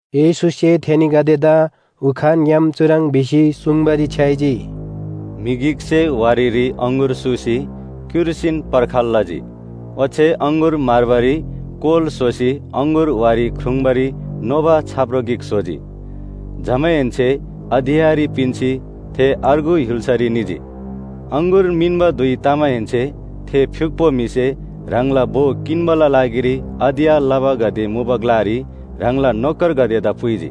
येशूसे थेनीगदेदा उखानग्‍याम चुह्रङ् भिसी सुङ्बारी छ्‌याइजी, “म्‍हि गिकसे वारीरी अङगुर सूसी क्‍युर्सीन पर्खाल लजी। ओच्‍छे अङगुर म्‍हर्बारी कोल स्‍होसी अङगुर वारी ख्रुङ्बारी नोबा छाप्रो गिक स्‍होजी। जमाहेन्‍से अधियाँरी पिन्‍सी थे अर्गु य्‍हुल्‍सारी निजी। अङगुर मिन्‍बा धुइ तमाहेन्‍से थे फ्‍युक्‍पो म्‍हिसे ह्राङला भो किन्‍बाला लागिरी अधियाँ लबागदे मुबा ग्‍लारी ह्राङला नोकरगदेदा पुइजी।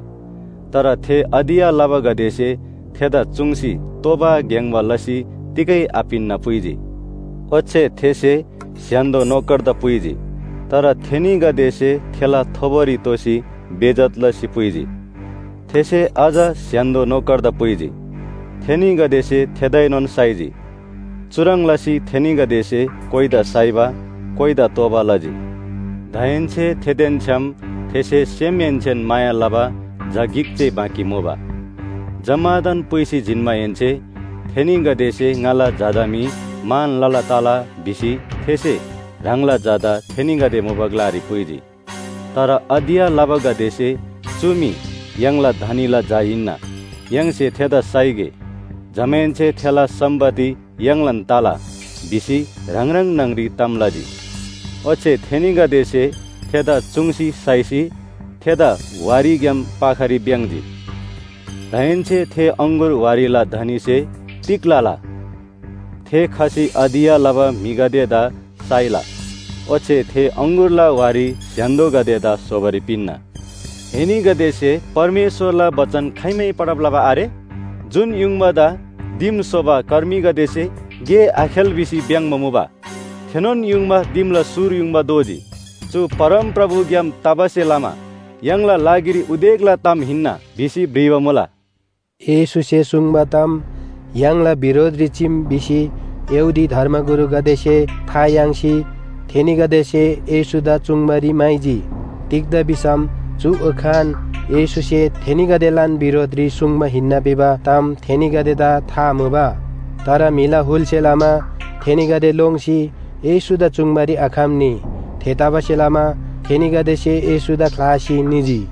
तर थे अधियाँ लबागदेसे थेदा चुङ्सी तोबा ग्‍याङ्‍बा लसी तिगै आपिन्‍ना पुइजी। ओच्‍छे थेसे स्‍य्‍हान्‍दो नोकरदा पुइजी, तर थेनीगदेसे थेला थोबोरी तोसी बेइज्‍जत लसी पुइजी। थेसे अझ स्‍य्‍हान्‍दो नोकरदा पुइजी। थेनीगदेसे थेदाएनोन साइजी। चुह्रङ् लसी थेनीगदेसे कोइदा साइबा कोइदा तोबा लजी। “दाहेन्‍से थेदेन छ्‌याम थेसे सेमहेन्‍सेन माया लबा झा गिक जे बाँकी मुबा। जम्‍मादान पुइसी जिन्‍माहेन्‍से ‘थेनीगदेसे ङाला झादा मी मान लला तला’ भिसी थेसे ह्राङला झादा थेनीगदे मुबा ग्‍लारी पुइजी। तर अधियाँ लबागदेसे ‘चु मी य्‍हाङला धनीला झा हिन्‍ना, य्‍हाङसे थेदा साइगे। जमाहेन्‍से थेला सम्‍पत्ति य्‍हाङलान तला’ भिसी ह्राङ ह्राङ न्‍हङरी ताम लजी। ओच्‍छे थेनीगदेसे थेदा चुङ्सी साइसी थेदा वारीग्‍याम पाखारी भ्‍याङ्‍जी। “दाहेन्‍से थे अङगुर वारीला धनीसे तिग लला? थे खसी अधियाँ लबा म्‍हिगदेदा साइला ओच्‍छे थे अङगुरला वारी स्‍य्‍हान्‍दोगदेदा स्‍होबारी पिन्‍ना। एनीगदेसे परमेश्‍वरला बचन खाइमै पढब लबा आरे? ‘जुन युङबादा दिम स्‍होबा कर्मीगदेसे गे आखेल भिसी भ्‍याङ्‍बा मुबा, थेनोन युङबा दिमला सुर युङबा दोजी। चु परमप्रभुग्‍याम तबासे लमा य्‍हाङला लागिरी उदेकला ताम हिन्‍ना’ भिसी भ्रिबा मुला।” येशूसे सुङ्बा ताम य्‍हाङला बिरोधरी चीम भिसी यहूदी धर्मगुरुगदेसे था याङ्सी थेनीगदेसे येशूदा चुङ्बारी म्‍हाइजी। तिग्‍दा भिसम चु उखान येशूसे थेनीगदेलान बिरोधरी सुङ्बा हिन्‍ना भिबा ताम थेनीगदेदा था मुबा। तर म्‍हिला हुलसे लमा थेनीगदे लोङ्सी येशूदा चुङ्बारी आखम्‍नी। थेतबासेलमा थेनीगदेसे येशूदा ख्‍लासी निजी।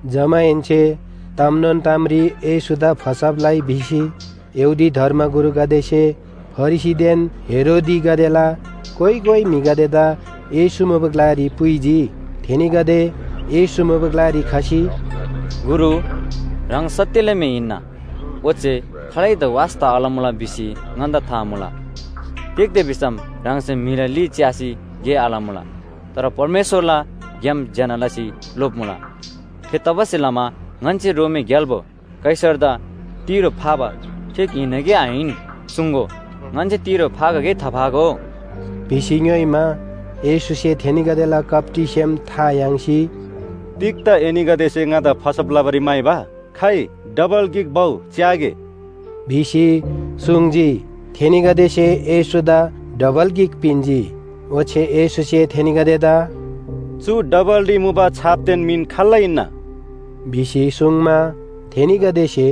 जमाहेन्‍से तामनोन तामरी येशूदा फसब लइ भिसी यहूदी धर्मगुरुगदेसे फरिसीदेन हेरोदीगदेला कोइ कोइ म्‍हिगदेदा येशू मुबा ग्‍लारी पुइजी। थेनीगदे येशू मुबा ग्‍लारी खसी, “गुरु, ह्राङ सत्‍यला म्‍हि हिन्‍ना, ओच्‍छे खालैदा वास्‍ता आलमुला भिसी ङन्‍दा था मुला। तिग्‍दा भिसम ह्राङसे म्‍हिला ली च्‍यासी गे आलमुला। तर परमेश्‍वरला ग्‍याम ज्‍यना लसी लोप्‍मुला। थेतबासेलमा ङन्‍से रोमी ग्‍याल्‍बो कैसरदा तिरो फाबा ठीक हिन्‍ना कि आहिन? सुङ्‍गो। ङन्‍से तिरो फागो कि थाफागो?” भिसी ङ्‌योइमा, येशूसे थेनीगदेला कप्‍टी सेम था याङ्सी, “तिग्‍दा एनीगदेसे ङादा फसब लबारी म्‍हाइबा? खाइ डबल गिक भउ च्‍यागे” भिसी सुङ्जी। थेनीगदेसे येशूदा डबल गिक पिन्‍जी, ओच्‍छे येशूसे थेनीगदेदा “चु डबलरी मुबा छापदेन मिन खाल्‍ला हिन्‍ना?” भिसी सुङ्मा, थेनीगदेसे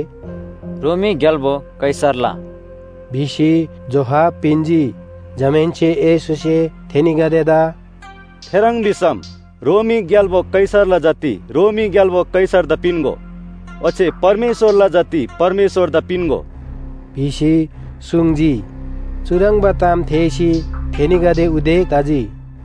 “रोमी ग्‍याल्‍बो कैसरला” भिसी जोहाब पिन्‍जी। जमाहेन्‍से येशूसे थेनीगदेदा “थेह्रङ् भिसम रोमी ग्‍याल्‍बो कैसरला जति रोमी ग्‍याल्‍बो कैसरदा पिन्‍गो ओच्‍छे परमेश्‍वरला जति परमेश्‍वरदा पिन्‍गो” भिसी सुङ्जी। चुह्रङ्बा ताम थेःसी थेनीगदे उदेक तजी।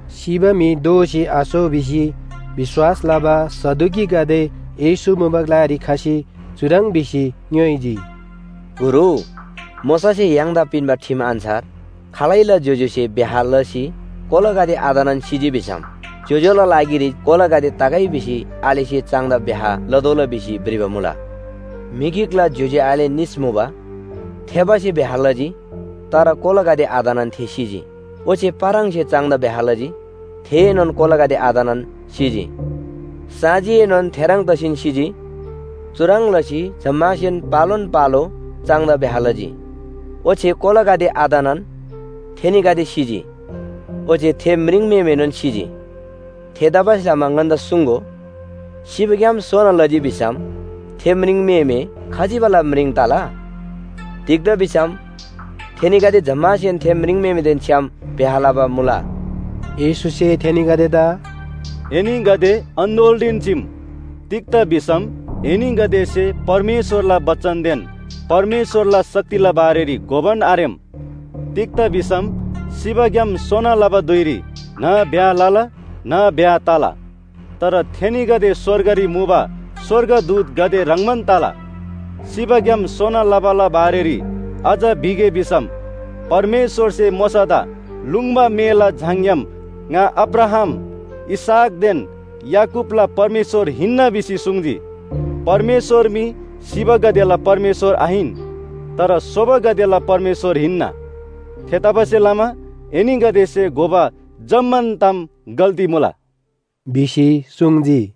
सिबा म्‍हि दोःसी आसो भिसी विश्‍वास लबा सदुकीगदे येशू मुबा ग्‍लारी खसी चुह्रङ् भिसी ङ्‌योइजी, “गुरु, मोशासे य्‍हाङदा पिन्‍बा ठिम अन्‍छार खालैला ज्‍योज्‍योसे ब्‍याह लसी कोलागदे आतनान सिजी भिसम ज्‍योज्‍यो‍ला लागिरी कोलागदे तगै भिसी आलेसे चाङदा ब्‍याह लतोःला भिसी भ्रिबा मुला। म्‍हि गिकला ज्‍योज्‍यो आले निस मुबा। थेबासे ब्‍याह लजी तर कोलागदे आतनान थे सिजी। ओच्‍छे पाराङसे चाङदा ब्‍याह लजी थेएनोन कोलागदे आतनान सिजी, साँजीएनोन थेह्रङ् तसीन सिजी। चुह्रङ् लसी जम्‍मासेन पालोन पालो चाङदा ब्‍याह लजी। ओच्‍छे कोलागदे आतनान थेनीगदे सिजी। ओच्‍छे थे म्रिङम्‍हेमेएनोन सिजी। थेतबासेलमा ङन्‍दा सुङ्‍गो, सिबाग्‍याम सोना लजी भिसम थे म्रिङम्‍हेमे खजिबाला म्रिङ तला? तिग्‍दा भिसम थेनीगदे जम्‍मासेन थे म्रिङम्‍हेमेदेन छ्‌याम ब्‍याह लबा मुला।” येशूसे थेनीगदेदा “एनीगदे अन्‍दोलरीन चीम, तिग्‍दा भिसम एनीगदेसे परमेश्‍वरला बचनदेन परमेश्‍वरला शक्तिला बारेरी घोबान आरेम। तिग्‍दा भिसम सिबाग्‍याम सोना लबा धुइरी न्‍ह ब्‍याह लला न्‍ह ब्‍याह तला। तर थेनीगदे स्‍वर्गरी मुबा स्‍वर्गदूतगदे ह्रङ्‌बान तला। सिबाग्‍याम सोना लबाला बारेरी अझ भिगे भिसम परमेश्‍वरसे मोशादा लुङ्बा मेला झाङग्‍याम ‘ङा अब्राहाम, इसहाकदेन याकूबला परमेश्‍वर हिन्‍ना’ भिसी सुङ्जी। परमेश्‍वर मी सिबागदेला परमेश्‍वर आहिन, तर सोबागदेला परमेश्‍वर हिन्‍ना। थेतबासेलमा एनीगदेसे घोबा जम्‍मान ताम गल्‍ती मुला” भिसी सुङ्जी।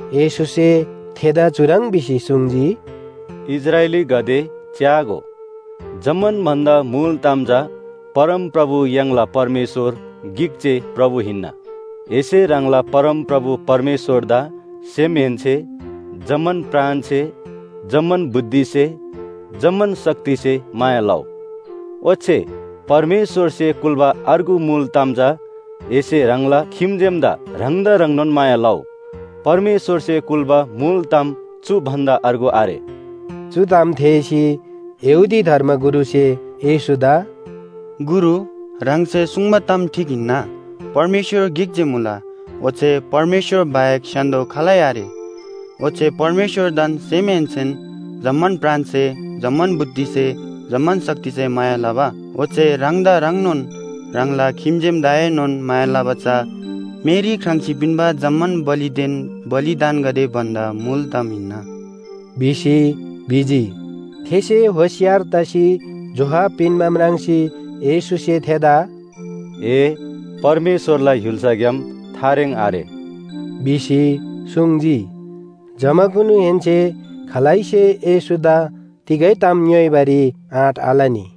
येशूसे थेदा चुह्रङ् भिसी सुङ्जी, “‘इस्राएलीगदे च्‍यागो, जम्‍मान भन्‍दा मुल ताम चा परमप्रभु य्‍हाङला परमेश्‍वर गिक जे प्रभु हिन्‍ना। एसे ह्राङला परमप्रभु परमेश्‍वरदा सेमहेन्‍से, जम्‍मान प्राणसे, जम्‍मान बुद्धिसे, जम्‍मान शक्तिसे माया लउ।’ ओच्‍छे परमेश्‍वरसे कुल्‍बा अर्गु मुल ताम चा ‘एसे ह्राङला खिम्‍जेमदा ह्राङदा ह्रङ्नोन माया लउ।’ परमेश्‍वरसे कुल्‍बा मुल ताम चु भन्‍दा अर्गु आरे।” चु ताम थेःसी यहूदी धर्मगुरुसे येशूदा “गुरु, ह्राङसे सुङ्बा ताम ठीक हिन्‍ना। परमेश्‍वर गिक जे मुला, ओच्‍छे परमेश्‍वर बाहेक स्‍य्‍हान्‍दो खालै आरे। ओच्‍छे परमेश्‍वरदान सेमहेन्‍सेन, जम्‍मान प्राणसे, जम्‍मान बुद्धिसे, जम्‍मान शक्तिसे माया लबा, ओच्‍छे ह्राङदा ह्रङ्नोन ह्राङला खिम्‍जेमदाएनोन माया लबा चा मेरी ख्राङ्‌सी पिन्‍बा जम्‍मान बलिदेन बलिदानगदे भन्‍दा मुल ताम हिन्‍ना” भिसी भिजी। थेसे होशियार तसी जोहाब पिन्‍बा म्राङ्सी येशूसे थेदा “ए परमेश्‍वरला य्‍हुल्‍साग्‍याम थारेङ आरे” भिसी सुङ्जी। जमाकुनुहेन्‍से खालैसे येशूदा तिगै ताम ङ्‌योइबारी आँट आलनी।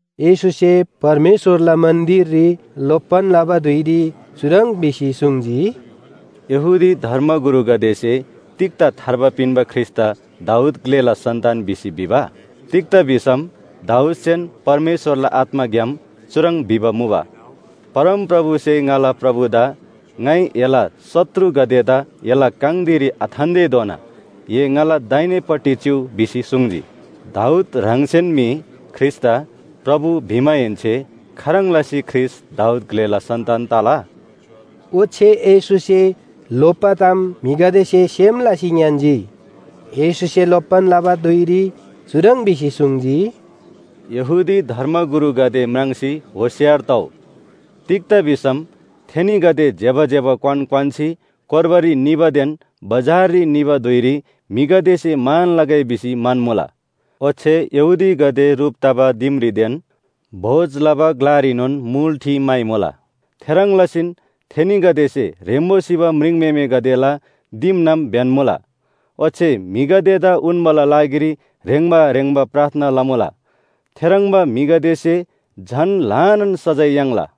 येशूसे परमेश्‍वरला मन्‍दिररी लोप्‍बान लबा धुइरी चुह्रङ् भिसी सुङ्जी, “यहूदी धर्मगुरुगदेसे तिग्‍दा थार्बा पिन्‍बा ख्रीष्‍टदा दाऊद ग्‍लेला सन्‍तान भिसी भिबा? तिग्‍दा भिसम दाऊदसेन परमेश्‍वरला आत्‍माग्‍याम चुह्रङ् भिबा मुबा, ‘परमप्रभुसे ङाला प्रभुदा ङाइ एला शत्रुगदेदा एला काङ धिरी आथान्‍तेधोना ए ङाला दाहिनेपट्टि चिउ’ भिसी सुङ्जी। “दाऊद ह्राङसेन मी ख्रीष्‍टदा ‘प्रभु’ भिमाहेन्‍से खाह्रङ् लसी ख्रीष्‍ट दाऊद ग्‍लेला सन्‍तान तला?” ओच्‍छे येशूसे लोप्‍बा ताम म्‍हिगदेसे सेम लसी ङ्‌यान्‍जी। येशूसे लोप्‍बान लबा धुइरी चुह्रङ् भिसी सुङ्जी, “यहूदी धर्मगुरुगदे म्राङ्सी होशियार तउ। तिग्‍दा भिसम थेनीगदे ज्‍यबा ज्‍यबा क्‍वान क्‍वान्‍सी कोर्बारी निबादेन बजाररी निबा धुइरी म्‍हिगदेसे मान लगै भिसी म्‍हन्‍मुला। ओच्‍छे यहूदीगदे ह्रुप तबा दिमरीदेन भोज लबा ग्‍लारीनोन मुल ठि म्‍हाइमुला। थेह्रङ् लसीन थेनीगदेसे ह्रेम्‍बो सिबा म्रिङम्‍हेमेगदेला दिमनाम ब्‍यन्‍मुला। ओच्‍छे म्‍हिगदेदा उन्‍बाला लागिरी ह्रेङ्बा ह्रेङ्बा प्रार्थना लमुला थेह्रङ्बा म्‍हिगदेसे झन ल्‍हानान सजाय याङ्ला।”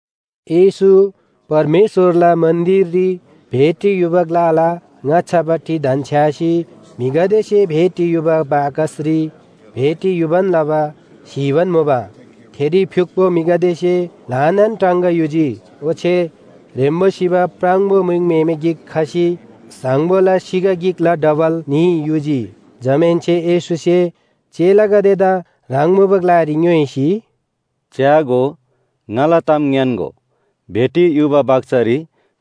येशू परमेश्‍वरला मन्‍दिररी भेटी युबा ग्‍लाला ङाच्‍छापट्टि धन्‍छ्‌यासी म्‍हिगदेसे भेटी युबा बाकसरी भेटी युबान लबा स्‍हीबान मुबा। थेरी फ्‍युक्‍पो म्‍हिगदेसे ल्‍हानान टाङगा युजी। ओच्‍छे ह्रेम्‍बो सिबा प्राङबो म्रिङम्‍हेमे गिक खसी साङबोला सिगा गिकला डबल न्‍ही युजी। जमाहेन्‍से येशूसे चेलागदेदा ह्राङ मुबा ग्‍लारी ङ्‌योइसी, “च्‍यागो, ङाला ताम ङ्‌यान्‍गो। भेटी युबा बाकसरी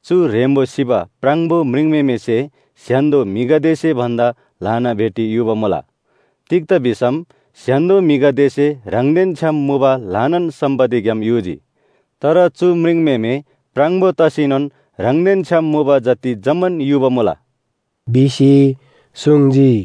चु ह्रेम्‍बो सिबा प्राङबो म्रिङम्‍हेमेसे स्‍य्‍हान्‍दो म्‍हिगदेसे भन्‍दा ल्‍हाना भेटी युबा मुला। तिग्‍दा भिसम स्‍य्‍हान्‍दो म्‍हिगदेसे ह्राङदेन छ्‌याम मुबा ल्‍हानान सम्‍पत्तिग्‍याम युजी। तर चु म्रिङम्‍हेमे प्राङबो तसीनोन ह्राङदेन छ्‌याम मुबा जति जम्‍मान युबा मुला” भिसी सुङ्जी।